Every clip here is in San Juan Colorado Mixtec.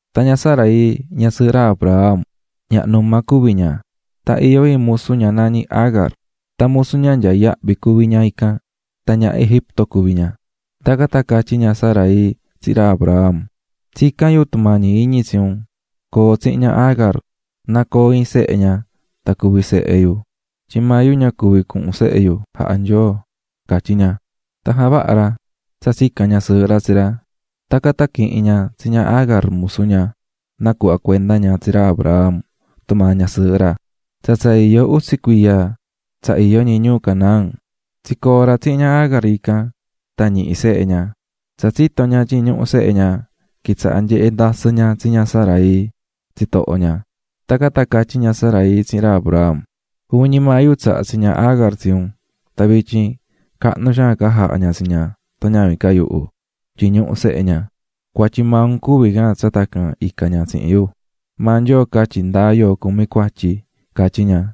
Tan ña Sarai, ñasɨɨhɨ ra Abram, ñaha numa cuví ña; tan iyó iin musu ña nañí Agar, tan musu ña nyaá yahvi cuví ña ican, tan ñaha Egipto cuví ña. Tacan tan catyí ña Sarai tsihin ra Abram: --Tsicán yu tumañi iñi tsi un: Co̱o tsihin ña Agar na coo iin sehe ña tan cuvi sehe yu, tyin maa yu ña tsahá Nyoo coo sehe yu --catyí ña. Tan javaha̱ ra tsa tsica̱n ñasɨɨhɨ ra tsi ra. Tacan tan quihi̱n ña tsi ña Agar, musu ña, nacuhva̱ cuenda ña tsi ra Abram tumaa ñasɨɨhɨ ra, tsa tsa iyó utsi cuiya tsa iyó ñi ñuu Canaán. Tsicoo̱ ra tsihin ña Agar ican, tan ñihi̱ sehe ña. Tsa tsito̱ ña tyin ñuhú sehe ña, quitsaha̱ nyehé ndasɨ ña tsi ña Sarai, tsitoho ña. Tacan tan catyí ña Sarai tsihin ra Abram: --Juvin ñi maa yu tsaha̱ tsi ña Agar tsi un, tan vityin cahnu xaan ca jahá ña tsi ña tan ñavin ca yuhu tyin ñuhú sehe ña. ¡Cuatyi maa un cuví can tsa tacan icá ña tsihin yu!. Maa Nyoo catyi ndáa yoo cumí cuatyi --catyí ña.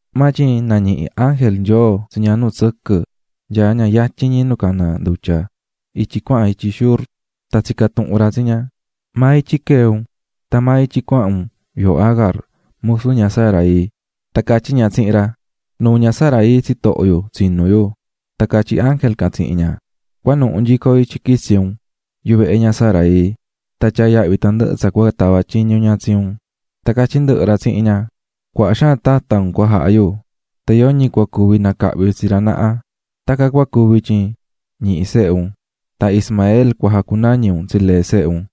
Maa tyin nañihi̱ ángel Nyoo tsi ña nu tsɨquɨ nyaá ña yatyin ñi nu caná ndutya ityi cuahan ityi Shur. Tan tsica̱ tuhun ra tsi ña: --¿Maa ityi quee̱ un tan maa ityi cuahan un?, yooho Agar, musu ña Sarai. Tan catyí ña tsihin ra: --Nuu ña Sarai, tsitoho yu, tsinú yu. Tan catyí ángel can tsihin ña: --Cua̱nuhu nyico yuvehe ña Sarai nu quee̱ un, ja̱vaha tandɨhɨ tsa cua tava tyiñu ña tsi un. Tan catyí ndɨhɨ ra tsihin ña: "Cuaha xaan tata un cua jaha yu, yoñi maa cua cuvi nacahvi tsi ra naha. Tacan cua cuvi tyin ñihi̱ sehe un, tan Ismael cua jacunañi un tsi lee sehe un.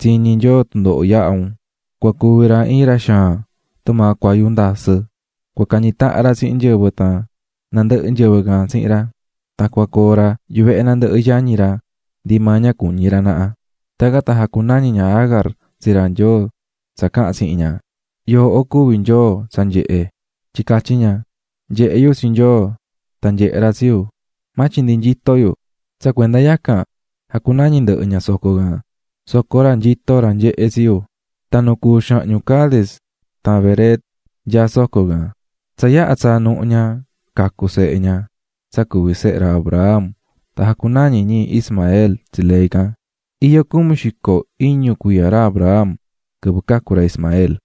tyin nyehé Nyoo tundoho yahá un. Cua cuvi ra iin ra xaan, tumaa cuayu ndasɨ. Cua cañi tahan ra tsihin nyɨvɨ tan nandɨhɨ nyɨvɨ can tsihin ra. Tan cua coo ra yuvehe nandɨhɨ yañi ra ndi maa ña cuñi ra naha." Tacan tan jacunañi̱ ña Agar tsi ra Nyoo tsa caha̱n tsihin ña: "Yooho cuví Nyoo tsa nyehé", tyin catyí ña: "Nyehe̱ yu tsi Nyoo tan nyehe̱ ra tsi yu, maa tyin ña tsihi̱ yu." Tsa cuenda yacan jacunañi̱ ndɨhɨ ña soco can: "Soco ra nyitó ra nyehé tsi yu." Tan nu cuú xahñu Cades tan Bered nyaá soco can. Tsa yaha tsaa̱ nuhu ña, cacu̱ sehe ña, tan jacunañi̱ ra Abram Ismael tsi lee can. Iyó cumi xico iñu cuiya ra Abram, quɨvɨ cacu̱ ra Ismael.